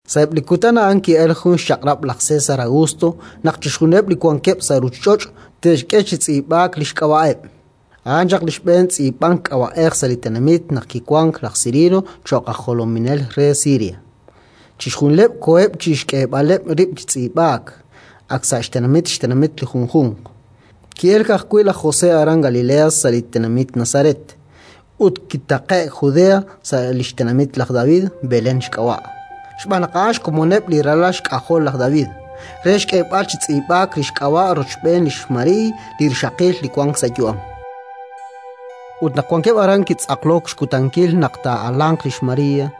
Sa'eb' li kutan a'an ki'elk jun xchaq'rab' laj César Augusto naq chixjunileb' li wankeb' sa' ruuchich'och' te'xk'e chi tz'iib'aak li xk'ab'a'eb'. A'an chaq li xb'een tz'iib'ank k'ab'a'ej sa' li tenamit naq kiwank laj Cirino cho'q aj jolominel re Siria. Chixjunileb' koheb' chi xk'eeb'aleb' rib' chi tz'iib'aak, ak sa' xtenamit xtenamit li junjunq. Ki'elk ajwi' laj José aran Galilea, sa' li tenamit Nazaret, ut kitaqe'k Judea, sa' li xtenamit laj David, Belén xk'ab'a' (xb'aan naq a'an xkomoneb' li ralal xk'ajol laj David), re xk'eeb'al chi tz'iib'aak li xk'ab'a' rochb'een lix María li rixaqil li wank sa' yu'am. Ut naq wankeb' aran, kitz'aqlok xkutankil naq taa'alanq lix María;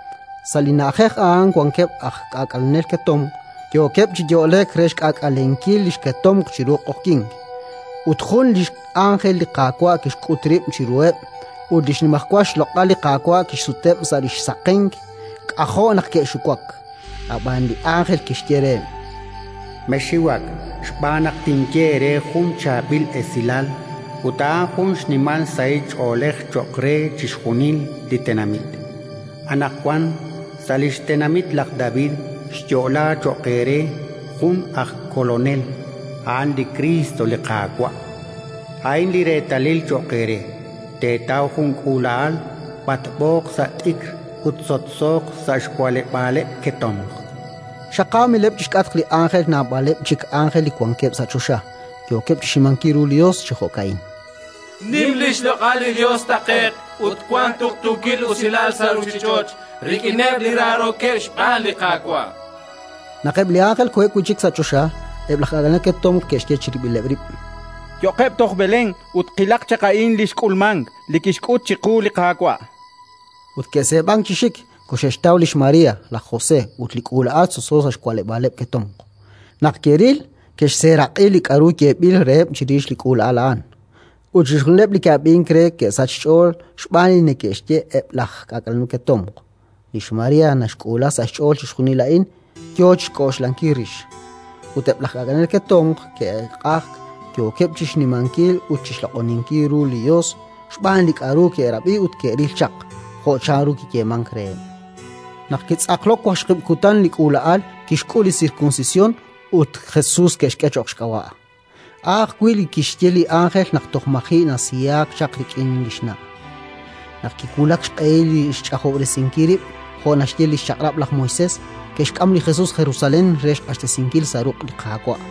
Sa' li na'ajej a'an wankeb' aj k'aak'alenel ketomq, yookeb' chi yo'lek re xk'aak'alenkil li xketomq chiru q'oqyink. Ut jun li x'ánjel li Qaawa' kixk'ut rib' chiruheb', ut li xnimajwal loq'al li Qaawa' kixsuteb' sa' li xsaqenk: k'ajo' naq ke'xiwak. Ab'an li ánjel kixye reheb': “Mexxiwak xb'aan naq tinye eere jun chaab'il esilal, ut a'an jun xnimal sahil ch'oolej cho'q re chixjunil li tenamit: Anaqwan, sa' li xtenamit laj David, xyo'laak cho'q eere jun aj Kolonel, a'an li Kriist, li Qaawa'. A'in li reetalil cho'q eere: teetaw jun k'uula'al b'atb'ooq sa' t'ikr ut sotsooq sa' xwa'leb'aaleb' ketomq”. Xaqaamileb' chi xk'atq li ánjel naab'aleb' chik ánjel li wankeb' sa' choxa, yookeb' chi xnimankil ru li Yos chi jo'ka'in: “Nim li xloq'al li Yos taqe'q ut wank tuqtuukil usilal sa' ruuchich'och' rik'ineb' li raarookeb' xb'aan li Qaawa'”. Naq eb' li ánjel koheb' wi' chik sa' choxa, eb' laj k'aak'alenel ketomq ke'xye chirib'ileb' rib': —Yo'qeb' toj Belén ut qilaq chaq a'in li xk'ulmank, li kixk'ut chiqu li Qaawa'. Ut ke'seeb'ank chi xik, koxe'xtaw lix María, laj José ut li k'uula'al sotso sa' xwa'leb'aaleb' ketomq. Naq ke'ril, ke'xseeraq'i li k'aru yeeb'il reheb' chirix li k'uula'al a'an; ut chixjunileb' li ke'ab'ink re ke'sachk xch'ool xb'aan li neke'xye eb' laj k'aak'alenel ketomq. Lix María naxk'uula sa' xch'ool chixjunil a'in, yo chi xk'oxlankil rix. Ut eb' laj k'aak'alenel ketomq ke'q'ajk, yookeb' chi xnimankil ut chi xloq'oninkil ru li Yos xb'aan li k'aru ke'rab'i ut ke'ril chaq, jo' chanru kiyeemank reheb'. Naq kitz'aqlok waqxaqib' kutan li k'uula'al, kixk'ul li sirkunsisyon ut Jesus ke'xk'e cho'q xk'ab'a', a' ajwi' li kixye li ánjel naq toj maji' nasiyaak chaq rik'in li xna'. Naq kiwulak xq'ehil li xch'ajob'resinkileb' rib', jo' naxye li xChaq'rab' laj Moisés, ke'xk'am li Jesus Jerusalén re xq'axtesinkil sa' ruq' li Qaawa',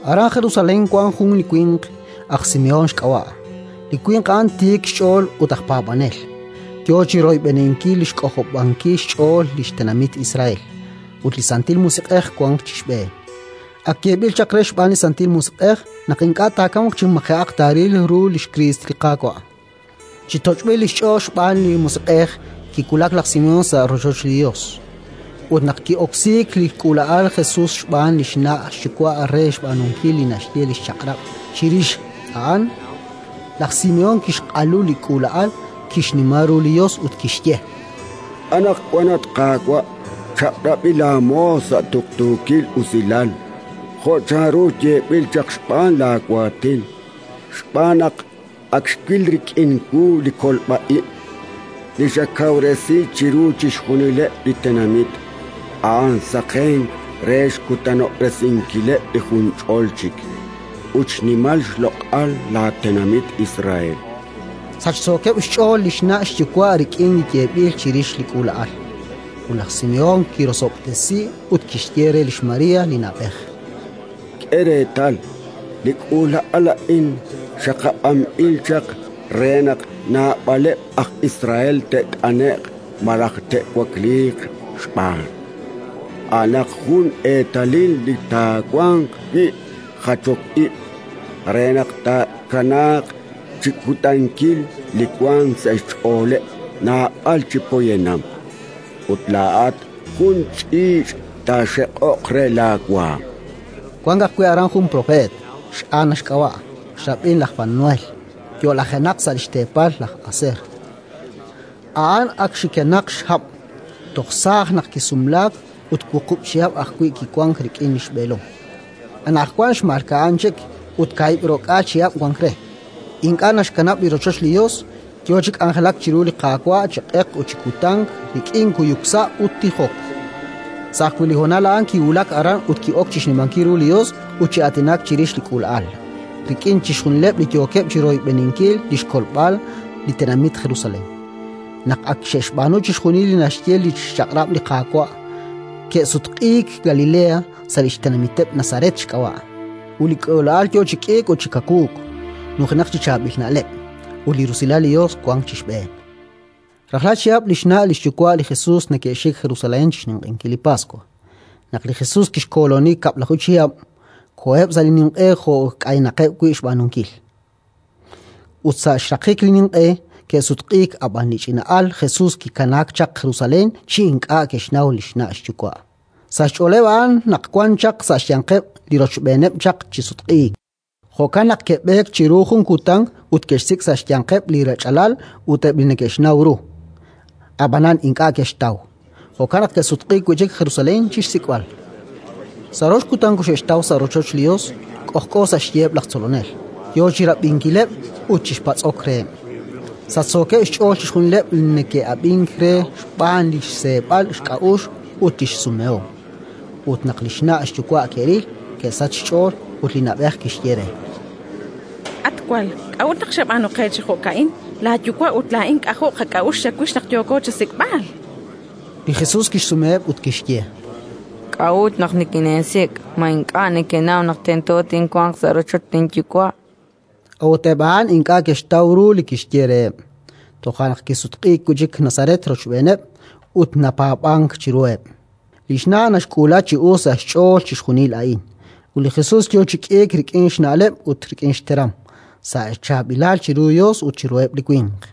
Aran Jerusalén wank jun li winq, aj Simehón xk'ab'a': li winq a'an tiik xch'ool ut aj paab'anel, yo chi royb'eninkil li xk'ojob'ankil xch'ool li tenamit Israel; ut li Santil Musiq'ej wank chi xb'een. Ak yeeb'il chaq re xb'aan li Santil Musiq'ej naq ink'a' taakamq chi maji'aq taaril ru li xKriist li Qaawa'. Chi toch'b'il li xch'ool xb'aan li Musiq'ej, kiwulak laj Simehón sa' rochoch li Yos. Ut naq ki'oksiik li k'uula'al Jesus xb'aan li xna' xyuwa' re xb'aanunkil li naxye li Chaq'rab' chirix a'an, laj Simehón kixq'alu li k'uula'al, kixnima ru li Yos ut kixye: “Anaqwan, at Qaawa', chaq'rab'i laamoos sa' tuqtuukil usilal, jo' chanru yeeb'il chaq xb'aan laawaatin, xb'aan naq ak xwil rik'in wu li kolb'a ib' li xakawresi chiru chixjunileb' li tenamit: a'an saqenk re xkutanob'resinkileb' li junch'ol chik, ut xnimal xloq'al laatenamit Israel”. Sachsookeb' xch'ool li xna' xyuwa' rik'in li yeeb'il chirix li k'uula'al. Ut laj Simehón kirosob'tesiheb' ut kixye re lix María li na'b'ej: —K'e reetal. Li k'uula'al a'in xaqab'anb'il chaq re naq naab'aleb' aj Israel te't'ane'q malaj te'wakliiq xb'aan. A'anaq jun eetalil li taawanq wi' jachok ib', re naq tkanaaq chi kutankil li wank sa' xch'ooleb' naab'al chi poyanam. Ut laa'at jun ch'iich' taaxeq'oq re laawaanm. Wank ajwi' aran jun propeet, x'Ana xk'ab'a', xrab'in laj Fanuel, yo'lajenaq sa' li xteepal laj Aser. A'an ak xikenaq xhab'. Toj saaj naq kisumlaak ut wuqub' chihab' ajwi' kiwank rik'in li xb'eelom. Anaqwan xmalka'an chik ut kaahib' ro'k'aal chihab' wank re. Ink'a' naxkanab' li rochoch li Yos, yo chi k'anjelak chiru li Qaawa' chi q'eq ut chi kutan rik'in kuyuk sa' ut tijok. Sa' ajwi' li honal a'an kiwulak aran ut ki'ok chi xnimankil ru li Yos ut chi aatinak chirix li k'uula'al rik'in chixjunileb' li yookeb' chi royb'eninkil li xkolb'al li tenamit Jerusalén. Naq ak xe'xb'aanu chixjunil li naxye li xChaq'rab' li Qaawa', ke'sutq'iik Galilea, sa' li xtenamiteb', Nazaret xk'ab'a'. Ut li k'uula'al yo chi k'iik ut chi kawuuk, nujenaq chi chaab'il na'leb'; ut li rusilal li Yos wank chi xb'een. Rajlal chihab' li xna' xyuwa' li Jesus neke'xik Jerusalén chi xninq'ehinkil li Paswa. Naq li Jesus kixkooloni kab'laju chihab', koheb' sa' li ninq'e jo' k'aynaqeb' xb'aanunkil. Ut sa' xraqik li ninq'e, ke'sutq'iik; ab'an li ch'ina'al Jesus kikanaak chaq Jerusalén chi ink'a' ke'xnaw li xna' xyuwa'. Sa' xch'oleeb' a'an naq wan chaq sa' xyanqeb' li rochb'eeneb' chaq chi sutq'iik; jo'kan naq ke'b'eek chiru jun kutan ut ke'xsik' sa' xyanqeb' li rech'alal ut eb' li neke'xnaw ru. Ab'anan ink'a' ke'xtaw; jo'kan naq ke'sutq'iik wi' chik Jerusalén chi xsik'b'al. Sa' rox kutan koxe'xtaw sa' rochoch li Yos, k'ojk'o sa' xyiheb' laj tzolonel, yo chi rab'inkileb' ut chi patz'ok reheb'. Sachsookeb' xch'ool chixjunileb' li neke'ab'ink re xb'aan li xseeb'al xk'a'uxl ut li xsumehom. Ut naq li xna' xyuwa' ke'ril, ke'sachk xch'ool, ut li na'b'ej kixye re: —At wal, k'a'ut naq xab'aanu qe chi jo'ka'in? Laayuwa' ut laa'in k'ajo' qak'a'uxl chawix naq yooko chasik'b'al. Li Jesus kixsumeheb' ut kixye: —K'a'ut naq nikineesik'? Ma ink'a' nekenaw naq tento tinwanq sa' rochoch linYuwa'? A'ut eb' a'an ink'a' ke'xtaw ru li kixye reheb'. Toja' naq kisutq'iik wi' chik Nazaret rochb'eeneb', ut napaab'ank chiruheb'. Li xna' naxk'uula chi us sa' xch'ool chixjunil a'in. Ut li Jesus yo chi k'iik rik'in xna'leb' ut rik'in xteram, sa' chaab'ilal chiru Yos ut chiruheb' li winq.